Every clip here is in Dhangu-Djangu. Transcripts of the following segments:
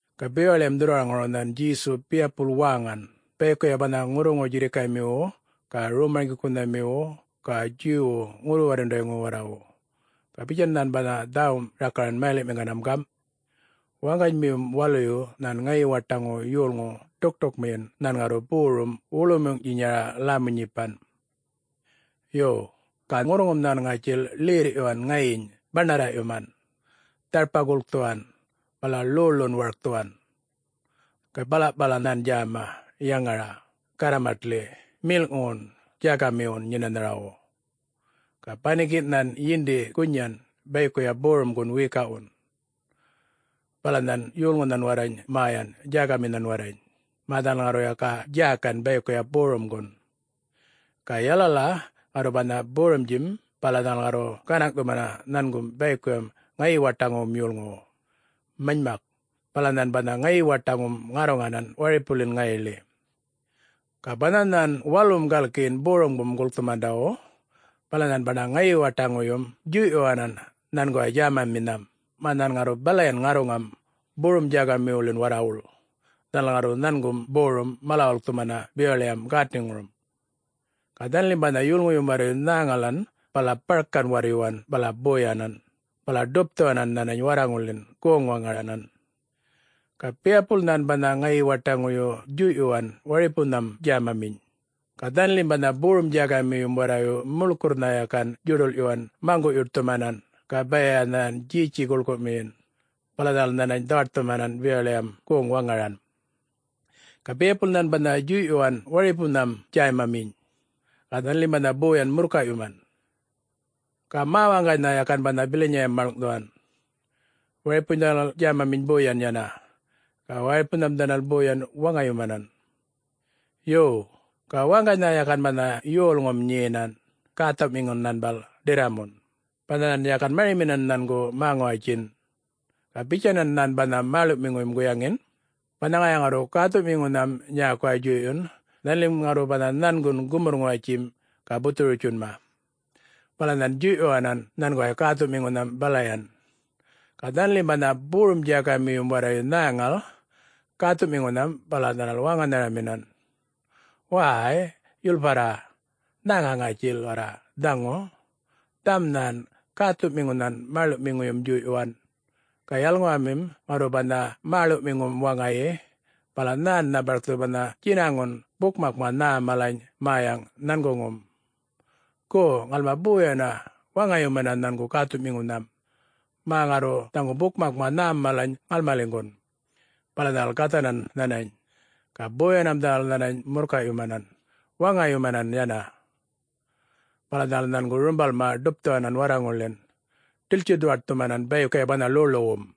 Ga bewaḻiyam dhurrwaraŋuru nhan Djesu biyapul wäŋan bayikuya banha ŋurruŋu-djirrikaymiwu ga rom-marŋgikunhamiwu ga Djuwwu ŋurru-warrundayŋuwu warrawu. Ga bitjan nhan banha dhäwum rakaran mayaliꞌmiŋganam gamꞌ, “Waŋganymiyum waluyu nhan ŋayi-waṯaŋu yolŋu ḏukṯukmiyin nhän ŋarru borum, wuḻuymuŋꞌtjinya lämu-nyipan. Yo, ga ŋurruŋum nhan ŋätjil ḻerrꞌyuwan ŋayiny baṉarraꞌyuman, dharpa gulkthuwan, bala ḻoḻun warkthuwan. Ga balaꞌpala nhan djäma yaŋaraꞌ garramatḻi melꞌŋuwun djägamiwu nyenanhawu. Ga banikinꞌ nhan yindi gunyan bayikuya borumgun wiyikaꞌwun. Bala nhan yolŋunhan warrany mäyan djägaminhan warrany, mä dhanal ŋarru yaka djägan bayikuya borumgun. Ga yalala ŋarru banha borumdjim bala dhanal ŋarru gänaŋꞌthumana nhangum bayikuyam ŋayi-waṯaŋuwum yolŋu. Manymak, bala nhan banha ŋayi-waṯaŋum ŋarruŋanan waripuḻin ŋayiḻi. Ga banha nhan walum galkiyin borumgum gulkthundawu, bala nhan banha ŋayi-waṯaŋuyum djuyꞌyuwanan nhanguway djämaminham, mä nhan ŋarru balayan ŋarruŋam borum-djägamiwuḻin warrawuḻ dhanal ŋarru nhangum borum mala-wulkthumana bewaḻiyam gätniŋurum. Ga dhanalim banha yolŋuyum warrayu nhäŋalan bala barkan warryuwan bala boyanan, bala ḏupthuwanan nhanany warraŋulḻin goŋ-waŋaranhan. Ga biyapul nhan banha ŋayi-waṯaŋuyu djuyꞌyuwan waripunham djämaminy. Ga dhanalim banha borum-djägamiyum warrayu muḻkurrnha yakan djuḏulꞌyuwan maŋguꞌ-yuṯthumanan ga baya nhan djetji guḻkumiyin. Bala dhanal nhanany dhawaṯthumanan bewaḻiyam goŋ-waŋaran. Ga biyapul nhan banha djuyꞌyuwan waripunham djämaminy. Ga dhanalim banha boyan murrkayꞌyuman. Ga mä-waŋganynha yakan banha bilanyayam maḻŋꞌthuwan. Waripuny dhanal djämaminy boyan yana, ga waripunham dhanal boyan waŋayumanan. Yo, ga waŋganynha yakan banha yolŋum nyenan, gäthuꞌmiŋun nhanbal, ḏirramun, banha nhan yakan mariminan nhangu mä-ŋuwatjin. Ga bitjanan nhan banha mäḻuꞌmiŋuyum guyaŋin, ‘Banha ŋaya ŋarru gäthuꞌmiŋunham nyäkuway djuyꞌyun, dhanalim ŋarru banha nhangun gumurr-ŋuwatjim ga buthuru-witjunma.’ Bala nhan djuyꞌyuwanan nhanguway gäthuꞌmiŋunham balayan. Ga dhanalim banha borum-djägamiyum warrayu nhäŋal gäthuꞌmiŋunham bala dhanal wäŋanharaminan, ‘Wäy, yulparra, nhäŋa ŋatjil warra dhaŋu! Dhaŋum nhan gäthuꞌmiŋunhan mäḻuꞌmiŋuyum djuyꞌyuwan. Ga yalalaŋumim ŋarru banha mäḻuꞌmiŋum waŋayi, bala nhännha barkthu banha djinaŋun bukmakma nhä malany mäyaŋ nhanguŋum. Gu, ŋalma boyana waŋayumana nhangu gäthuꞌmiŋunham, mä ŋarru dhaŋu bukmakma nhäm mala ŋalmaliŋgun.’ Bala dhanal gathanan nhanany, ga boyanam dhanal nhanany murrkayꞌyumanan, waŋayumanan yana. Bala dhanal nhangu rumbalma ḏupthuwanan warraŋulḻin, ḏiltji-ḏuwaṯthumanan bayikuya banha ḻoḻuwum.”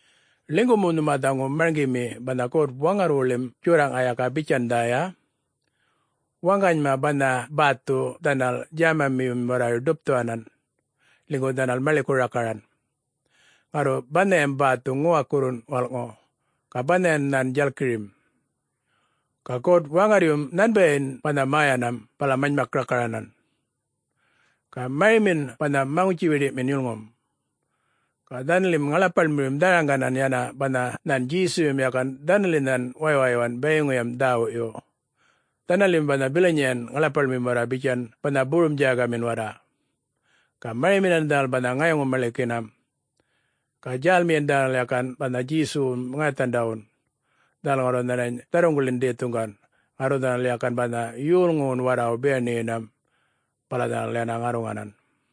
Ḻinygu mu nhuma dhaŋu marŋgimi banha God-Waŋarrwuḻim Djorraꞌŋa yaka bitjan dhäya, ‘Waŋganyma banha bäthu dhanal djämamiyum warrayu ḏupthuwanan, ḻinygu dhanal maḻiku rakaranan. Ŋarru banhayam bäthu ŋuwakurruꞌŋun walꞌŋu, ga banhayan nhan djalkirim. Ga God-Waŋarryun nhanbayim banha mäyanam bala manymak rakaranan. Ga marimin banha maŋutji-wiḏiꞌmin yulŋum!’” Ga dhanalim ŋaḻapaḻmiyum dharaŋganan yana banha nhan Djesuyum yakan dhanalinhan waywayyuwan bayiŋuyam dhäwuyu. Dhanalim banha bilanyan ŋaḻapaḻmim warra bitjan banha borum-djägamin warra. Ga mariminan dhanal banha ŋayaŋu-maḻikinam. Ga djälyinam dhanal yakan banha Djesuwum ŋayathandawun, dhanal ŋarru nhanany dharruŋguḻin dhethuŋgan. Ŋarru dhanal yakan banha yolŋuwun warrawu biyaṉiyinam, bala dhanal yana ŋarruŋanan.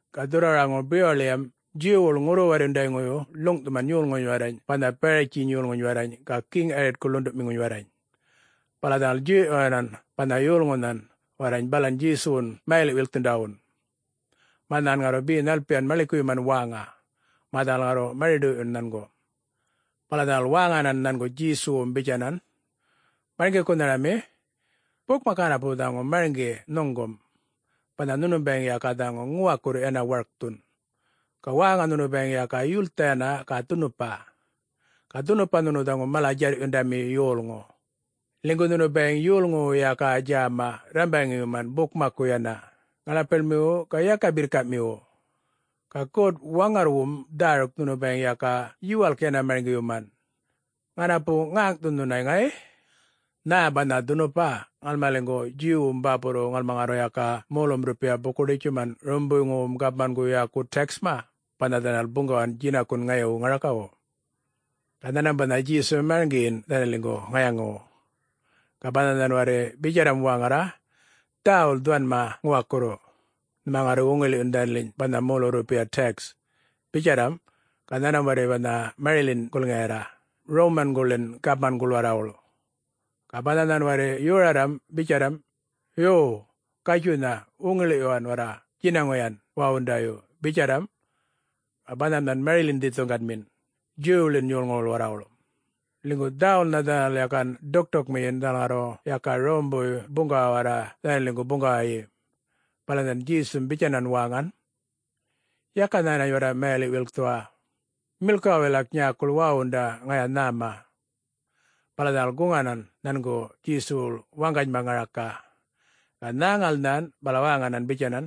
Ga dhurrwaraŋuru bewaḻiyam Djuwwuḻ ŋurru-warryundayŋuyu ḻuŋꞌthuman yolŋuny warrany banha Baratjiny yolŋuny warrany ga Geŋ Yaritku ḻunduꞌmiŋuny warrany. Bala dhanal djuyꞌyuwanan banha yolŋunham warrany balan Djesuwun mayaliꞌ-wilkthundawun, mä nhan ŋarru be nhalpiyan maḻikuyuman wäŋa, mä dhanal ŋarru mari-ḏoyꞌyuna nhangu. Bala dhanal wäŋanan nhangu Djesuwum bitjanan, “Marŋgikunharami, bukmak ŋanapu dhaŋu marŋgi nhuŋgum, banha nhunum bayiŋ yaka dhaŋu ŋuwakurru yana warkthun, ga wäŋa nhunu bayiŋ yaka yultha yana ga dhunupa. Ga dhunupa nhunu dhaŋu mala-djarryundami yolŋu, ḻinygu nhunu bayiŋ yolŋuwu yaka djäma rrambaŋiyuman bukmakku yana, ŋaḻapaḻmiwu ga yaka birrkamiwu. Ga God-Waŋarrwum dhäruk nhunu bayiŋ yaka yuwalk yana marŋgiyuman. Ŋanapu ŋäŋꞌthun nhuna ŋay... Nhä banha dhunupa ŋalmaliŋgu Djuwwum bäpurruwu ŋalma ŋarru yaka molum-rrupiya buku-ḏitjuman Rawumbuywum gapmangu yäku tax-ma, banha dhanal buŋgawan djinakun ŋayiwu ŋarakawu?” Ga nhanmam banha Djesum marŋgiyin dhanaliŋgu ŋayaŋuwu. Ga banha nhan warri bitjarram wäŋarra, ‘Dhäwul dhuwanma ŋuwakurru, nhuma ŋarru wuŋiḻiꞌyun dhanaliny banha molu-rrupiya tax,’ bitjarram, ga nhanmam warri banha mariḻin gulŋiyarra Rawumanguḻin gapmanguḻ warrawuḻ. Ga banha nhan warri yorarram bitjarram, ‘Yuw, Gatjuynha wuŋiḻiꞌyuwan warra djinaŋuyam wawaṉḏayu,’ bitjarram. Ga banham nhan mariḻin dhethuŋganmin Djuwwuḻin yolŋuwuḻ warrawuḻ, ḻinygu dhäwulnha dhanal yakan ḏukṯukmiyin dhanal ŋarru yaka Rawumbuy buŋgawa warra dhanaliŋgu buŋgawayi. Bala nhan Djesum bitjanan wäŋan, “Yaka nhänany warra mayaḻiꞌ-wilkthuwa. Milkuwa wilak nyäkuḻ wawaṉḏa, ŋaya nhäma.” Bala dhanal guŋganan nhanguḻ Djesuwuḻ waŋgany ŋaraka. Ga nhäŋal nhan, bala wäŋanan bitjanan,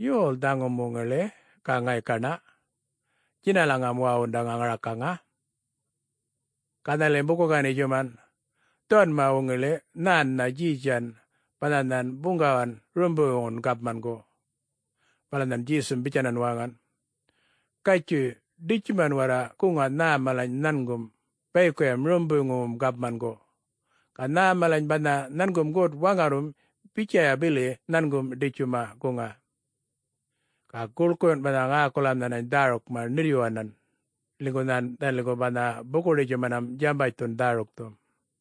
“Yol dhaŋum wuŋiḻi ga ŋaykaṉa djinalaŋam wawaṉḏaŋa ŋarakaŋa?” Ga dhanalim buku-ganitjuman, “Dhuwanma wuŋiḻi nhännha Djetjan banha nhan buŋgawan Rawumbuywun Gapmangu!” Bala nhan Djesum bitjanan wäŋan, “Gatjuy, ḏitjuman warra guŋa nhä malany nhangum bayikuyam Rawumbuywum gapmangu. Ga nhä malany banha nhangum God-Waŋarrwum bitjaya bili nhangum ḏitjuma guŋa.” Ga guḻkuyun banha ŋäkulam nhanany dhärukma ṉirrꞌyuwanan, linygu nhan dhanaliŋgu banha buku-ganitjumanam djambatjthun dhärukthum.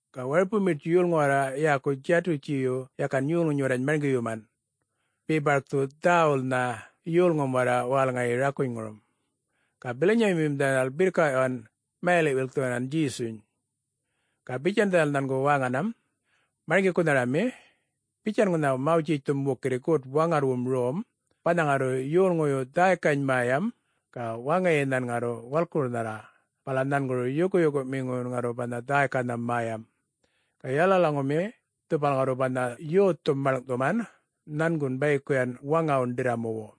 Ga waripu miṯtji yolŋu warra yäku Djatutjiyu yakan yolŋuny warrany marŋgiyuman, be barkthu dhäwulnha yolŋum warra wälŋayi rakunyŋurum. Ga bilanyamiyum dhanal birrkaꞌyuwan mayaliꞌ-wilkthuwan Djesuny. Ga bitjan dhanal nhangu wäŋanam, “Marŋgikunharami, bitjan ŋunha Mawtjitjthum wukirri God-Waŋarrwum rom: Banha ŋarru yolŋuyu dhäykany mäyam, ga waŋayi nhan ŋarru walkurnharra, bala nhanguru yukuyukuꞌmiŋuyun ŋarru banha dhäykanham mäyam. Ga yalalaŋumi dhupal ŋarru banha yothum maḻŋꞌthuman, nhangun bayikuyan waŋawun ḏirramuwu.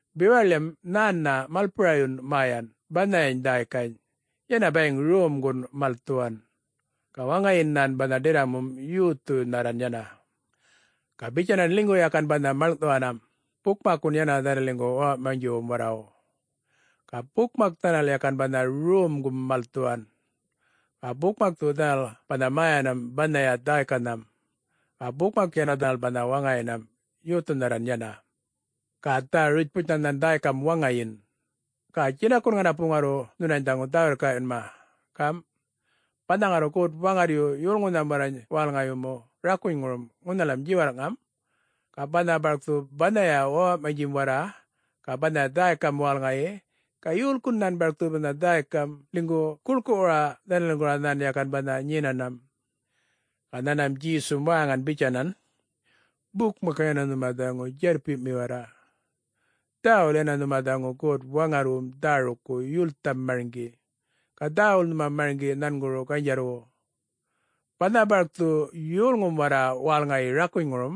Bewaḻim nhännha malpurayun mäyan banhayany dhäykany, yana bayiŋ romgun malthuwan. Ga waŋayin nhan banha ḏirramum yothunharra yana. Ga bitjanan ḻinygu yakan banha maḻŋꞌthuwanam bukmakkun yana dhanaliŋgu wäwaꞌmanydjiwum warrawu. Ga bukmak dhanal yakan banha romgum malthuwan, ga bukmakthu dhanal banha mäyanam banhaya dhäykanham. Ga bukmak yana dhanal banha waŋayinam yothunharran yana. Ga dhä-yurputjnha nhan dhäykam waŋayin. Ga djinakun ŋanapu ŋarru nhunany dhaŋu dhä-wirrkaꞌyunma, gamꞌ: Banha ŋarru God-Waŋarryu yolŋunham warrany wälŋayumu rakunyŋurum ŋunhalam djiwarrꞌŋam, ga banha barkthu banhaya wäwaꞌmanydjim warra ga banhaya dhäykam wälŋayi, ga yolkun nhan barkthu banha dhäykam, ḻinygu guḻkuꞌwura dhanaliŋguḻ nhan yakan banha nyenanam?” Ga nhanmam Djesum wäŋan bitjanan, “Bukmak yana nhuma dhaŋu djarrpiꞌmi warra. Dhäwul yana nhuma dhaŋu God-Waŋarrwum dhärukku yultham marŋgi, ga dhäwul nhuma marŋgi nhanguru ganydjarrwu. Banha barkthu yolŋum warra wälŋayi rakunyŋurum,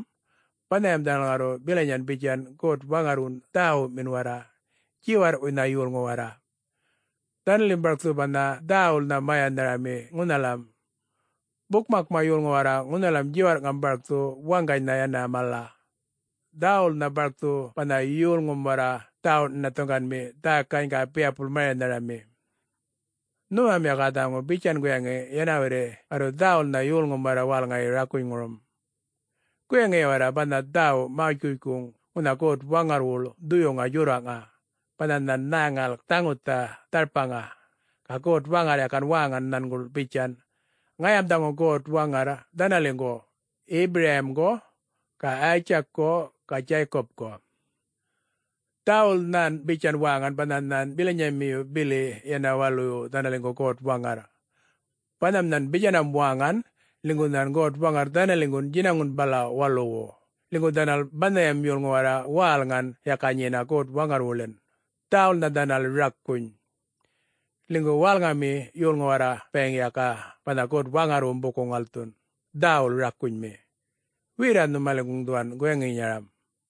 banhayam dhanal ŋarru bilanyan bitjan God-Waŋarrwun dhäwumin warra, djiwarrꞌwuynha yolŋu warra. Dhanalim barkthu banha dhäwulnha mäyanharami ŋunhalayam. Bukmakma yolŋu warra ŋunhalam djiwarrꞌŋam barkthu waŋganynha yana mala. Dhäwulnha barkthu banha yolŋum warra dhawuꞌ-nhinathuŋganmi dhäykany, ga biyapul mäyanharami. Nhumam yaka dhaŋu bitjan guyaŋi yana warri ŋarru dhäwulnha yolŋum warra wälŋayi rakunyŋurum. Guyaŋiya warra banha dhäwu Mawtjitjkuŋ ŋunha God-Waŋarrwuḻ Dhuyuŋa Djorraꞌŋa: banha nhan nhäŋal dhaŋutha dharpaŋa, ga God-Waŋarr yakan wäŋan nhanguḻ bitjan, ‘Ŋayam dhaŋu God-Waŋarr dhanaliŋgu Yipurayimgu ga Yitjakku ga Djaykupku.’ Dhäwul nhan bitjan wäŋan banha nhan bilanyamiyu bili yana waluyu dhanaliŋgu God-Waŋarr. Banham nhan bitjanam wäŋan, ḻinygu nhan God-Waŋarr dhanaliŋgu djinakun bala waluwu, linygu dhanal banhayam yolŋu warra wälŋan yaka nyena God-Waŋarrwuḻin, dhäwulnha dhanal rakuny. Ḻinygu wälŋami yolŋu warra bayiŋ yaka banha God-Waŋarrwum buku-ŋalthun, dhäwul rakunymi. Werra nhumaliŋguŋ dhuwan guyaŋinyaram.”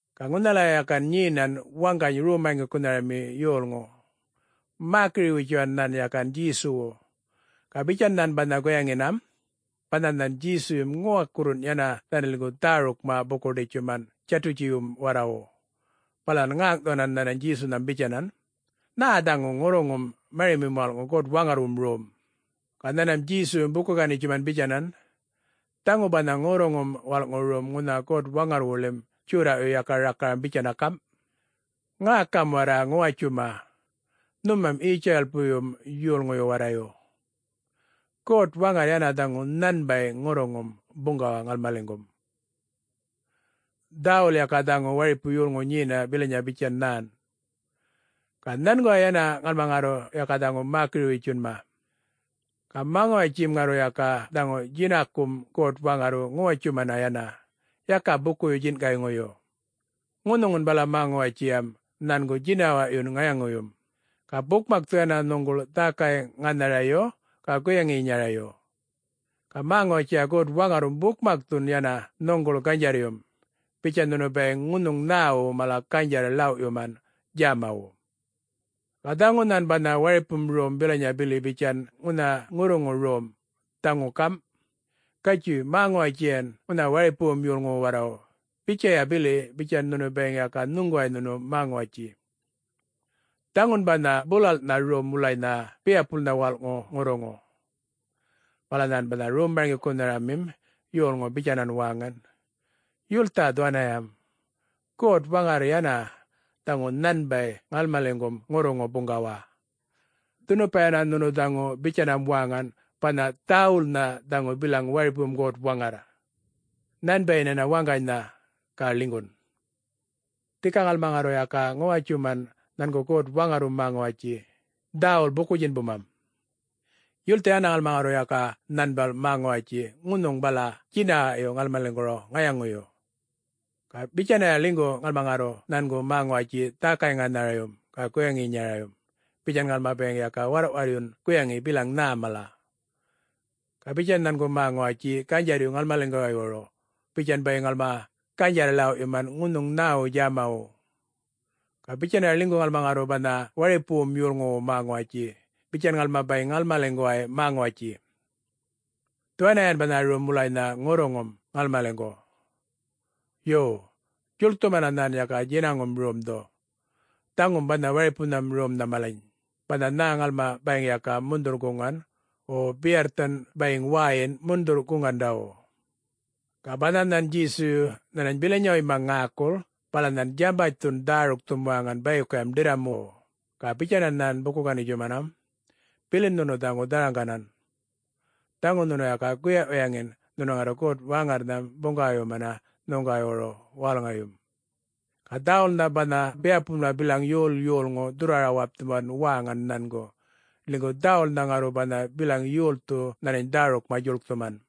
Ga ŋunhalaya yakan nyenan waŋgany rom-marŋgikunharami yolŋu, mäkiriꞌ-witjuwan nhan yakan Djesuwu. Ga bitjan nhan banha guyaŋinam: banha nhan Djesuyum ŋuwakurrun yana dhanaliŋgu dhärukma buku-ḏitjuman Djatutjiwum warrawu. Bala nhan ŋäŋꞌthuwanan nhanany Djesunham bitjanan, “Nhä dhaŋu ŋurruŋum marimim walꞌŋu God-Waŋarrwum rom?” Ga nhanmam Djesuyum buku-ganitjuman bitjanan, “Dhaŋu banha ŋurruŋum walꞌŋu rom ŋunha God-Waŋarrwuḻim djorraꞌyu yaka rakaram bitjan gamꞌ, ‘Ŋäkam warra ŋuwatjuma, nhumam Yitjuralpuyŋuyum yolŋuyu warrayu! God-Waŋarr yana dhaŋu nhanbay ŋurruŋum buŋgawa ŋalmaliŋgum, dhäwul yaka dhaŋu waripu yolŋu nyena bilanya bitjan nhän. Ga nhanguway yana ŋalma ŋarru yaka dhaŋu mäkiri-witjunma! Ga mä-ŋuwatjim ŋarru yaka dhaŋu djinakum God-Waŋarrwu ŋuwatjuman yana, yaka bukuyu-djinꞌkayŋuyu. Ŋunhuŋun bala mä-ŋuwatjiyam nhangu djinawaꞌyun ŋayaŋuyum, ga bukmakthu yana nhuŋguḻ dhäkay-ŋanharayu, ga guyaŋinyarayu. Ga mä-ŋuwatjiya God-Waŋarrwum bukmakthu yana nhuŋguḻ ganydjarryum, bitjan nhunu bayiŋ ŋunhuŋ nhäwu mala ganydjarr-ḻawꞌyuman djämawu.’ Ga dhaŋu nhan banha waripum rom bilanya bili bitjan ŋunha ŋurruŋu rom, dhaŋun gamꞌ: ‘Gatjuy, mä-ŋuwatjiyan ŋunha waripuwum yolŋuwu warrawu bitjaya bili bitjan nhunu bayiŋ ga nhuŋguway nhunu mä-ŋuwatji.’ Dhaŋun banha bulalꞌnha rom wulanynha biyapulma walꞌŋu ŋurruŋu.” Bala nhan banha rom-marŋgikunhamim yolŋu bitjanan wäŋan, “Yultha dhaŋuyam! God-Waŋarr yana dhaŋu nhanbay ŋalmaliŋgum ŋurruŋu buŋgawa. Dhunupa yana nhunu dhaŋu bitjanam wäŋan banha ‘Dhäwulnha dhaŋu bilaŋ waripum God-Waŋarr,... nhanbayin yana waŋganynha, ga ḻinygun!’ Dhika ŋalma ŋarru yaka ŋuwatjuman nhangu God-Waŋarrwum mä-ŋuwatji, dhäwul buku-djinbumam. Yultha yana ŋalma ŋarru yaka nhanbal mä-ŋuwatji ŋunhuŋ bala djinawaꞌyu ŋalmaliŋguru ŋayaŋuyu. Ga bitjanaya ḻinygu ŋalma ŋarru nhangu mä-ŋuwatji dhäkay-ŋänharayum, ga guyaŋinyarayum, bitjan ŋalma bayiŋ ga warrꞌwarryun guyaŋi bilaŋ nhä mala. Ga bitjan nhangu mä-ŋuwatji ganydjarryum ŋalmaliŋguwaywuru bitjan bayiŋ ŋalma ganydjarr-ḻawꞌyuman ŋunhuŋ nhäwu djämawu. Ga bitjanaya ḻinygu ŋalma ŋarru banha waripuwum yolŋuwu mä-ŋuwatji, bitjan ŋalma bayiŋ nyin ŋalmaliŋguway mä-ŋuwatji. Dhuwaniyan banha rom wulanynha ŋurruŋum ŋalmaliŋgu. Yo, djuḻkthumana nhan yaka djinaŋum romdhu, dhaŋum banha waripunham romnha malany, banha nhä ŋalma bayiŋ yaka mundhurr-guŋan, wo biyarrthan bayiŋ wäyin mundhurr-guŋandawu.” Ga banha nhan Djesuyu nhanany bilanyawuyma ŋäkul bala nhan djambatjthun dhärukthum wäŋan bayikuyam ḏirramuwu, ga bitjanan nhan buku-gänitjumanam, “Bilin nhunu dhaŋu dharaŋganan, dhaŋu nhunu yaka guyaꞌ-guyaŋin nhunu ŋarru God-Waŋarrnham buŋgawayumana nhuŋguwaywuru wälŋayum.” Ga dhäwulnha banha biyapulma bilaŋ yol yolŋu dhurrwara-wapthuwan wäŋan nhangu, ḻinygu dhäwulnha ŋarru banha bilaŋ yolthu nhanany dhärukma djuḻkthuman.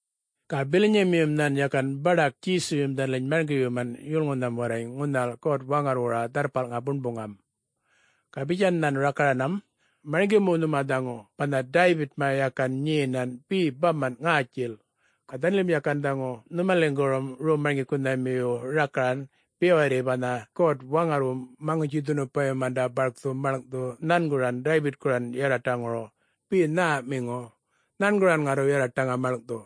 Ga bilanyamiyum nhan yakan baḏak Djesuyum dhanaliny marŋgiyuman yolŋunham warrany ŋunhal God-Waŋarrwura Dharrpalŋa Buṉbuŋam. Ga bitjan nhan rakaranam, “Marŋgi mu nhuma dhaŋu banha Daybitma yakan nyenan be bamanꞌ ŋätjil, ga dhanalim yakan dhaŋu nhumaliŋgurum rom-marŋgikunhamiyu rakaran, be warri banha God-Waŋarrwum Maŋutji-dhunupayumanda barkthu maḻŋꞌthu nhanguran Daybitkuran yarraṯaŋuru be nhäꞌmiŋu, nhanguran ŋarru yarraṯaŋa maḻŋꞌthu.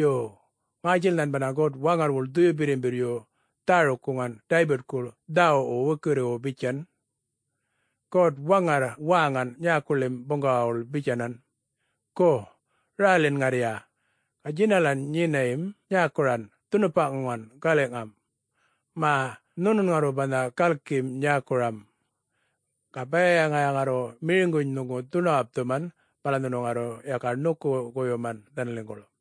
Yo, ŋätjil nhan banha God-Waŋarrwuḻ Dhuyu Birrimbirryu dhäruk-guŋan Daybitkuḻ dhäwuꞌwu wukirriwu bitjan: ‘God-Waŋarr wäŋan nyäkuḻim buŋgawawuḻ bitjanan, “Gu rälin ŋarrya, ga djinalan nyiniyam nyäkuran dhunupaꞌŋuŋan galiꞌŋam, mä nhunun ŋarru banha galkim nyäkuram, ga baya ŋaya ŋarru miriŋuny nhuŋgu dhuṉuwapthuman, bala nhunu ŋarru yaka ṉuku-goyuman dhanaliŋguḻ.’”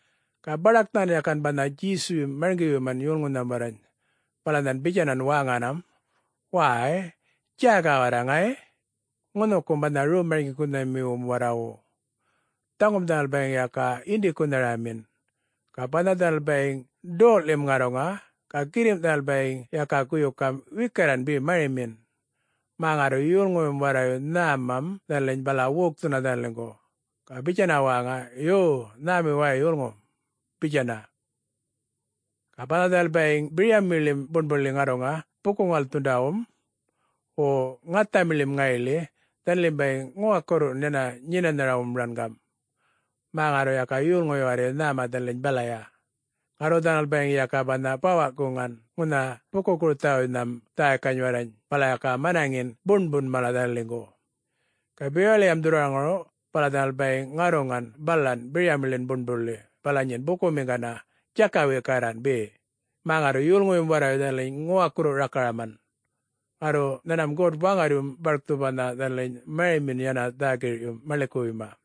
Ga baḏak nhan yakan banha Djesuyum marŋgiyuman yolŋunham warrany, bala nhan bitjanan wäŋanam, “Wäy, djäga warra ŋay, ŋunhukum banha rom-marŋgikunhamiwum warrawu! Dhaŋum dhanal bayiŋ yaka yindikunharamin. Ga banha dhanal bayiŋ doꞌḻim ŋarruŋa, ga girrimꞌ dhanal bayiŋ yaka guyukam wikarran be marimin, mä ŋarru yolŋuyum warrayu nhämam dhanaliny bala wokthuna dhanaliŋgu, ga bitjana wäŋa, ‘Yo, nhämi way yolŋu,’ bitjana. Ga banha dhanal bayiŋ biryamiḻim buṉbuḻi ŋarruŋa buku-ŋalthundawum, wo ŋathamiḻim ŋayiḻi, dhanalim bayiŋ ŋuwakurruwun yana nyenanhamiwum rangam, mä ŋarru yaka yolŋuyu warrayu nhäma dhanaliny balaya. Ŋarru dhanal bayiŋ yaka banha bawaꞌ-guŋan ŋunha buku-gurthawuynham dhäykany warrany bala yaka manaŋin buṉbun mala dhanaliŋgu. Ga bewaḻiyam dhurrwaraŋuru bala dhanal bayiŋ ŋarruŋan balan biryamiḻin buṉbuḻi bala nyin bukumiŋgana, djakaꞌ-wikarra be, mä ŋarru yolŋuyum warrayu dhanaliny ŋuwakurru-rakaraman. Ŋarru nhanmam God-Waŋarryum barkthu banha dhanaliny marimin yana dhä-girꞌyum maḻikuwuyma.”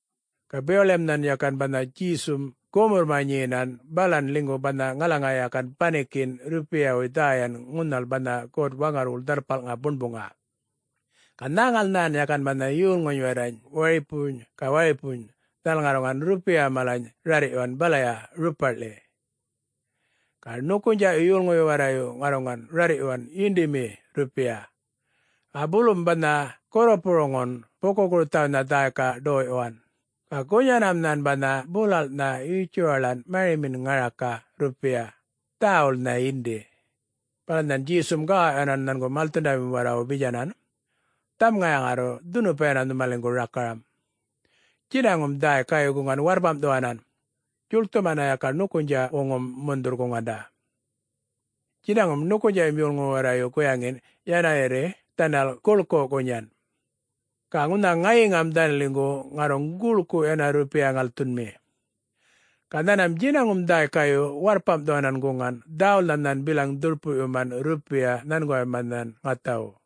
Ga bewaḻiyam nhan yakan banha Djesum gumurrma nyenan balan ḻinygu banha ŋalaŋa yakan banikinꞌ rrupiyawuy dhäyan ŋunhal banha God-Waŋarrwuḻ Dharrpalŋa Buṉbuŋa. Ga nhäŋal nhan yakan banha yolŋuny warrany waripuny ga waripuny dhanal ŋarruŋan rrupiya malany rarrꞌyuwan balaya rupaꞌḻi. Ga ṉukunydjaꞌyu yolŋuyu warrayu ŋarruŋan rarrꞌyuwan yinḏimi rrupiya. Ga bulum banha gurrupuruŋun buku-gurthawuynha dhäyka ḏoyꞌyuwan, ga gunyanam nhan banha bulalꞌnha yutjuwaḻan marimin ŋaraka rrupiya, dhäwulnha yindi. Bala nhan Djesum gawawꞌyuwanan nhangu malthundamiwum warrawu bitjanan, “Dhaŋum ŋaya ŋarru dhunupa yana nhumaliŋgu rakaram: Djinaŋum dhäykayu guŋan warrpamꞌthuwanan, djuḻkthumana yaka ṉukunydjaꞌwuŋum mundhurr-guŋanda. Djinaŋum ṉukunydjaꞌyu yolŋuyu warrayu guyaŋin yana warri dhanal guḻku gunyan. Ga ŋunha ŋayiŋam dhanaliŋgu ŋarruŋ guḻku yana rrupiya ŋalthunmi. Ga nhanmam djinaŋum dhäykayu warrpamꞌthuwanan guŋan, dhäwulnha nhän bilaŋ dhurpuꞌyuman rrupiya nhanguwayma nhan ŋathawu.”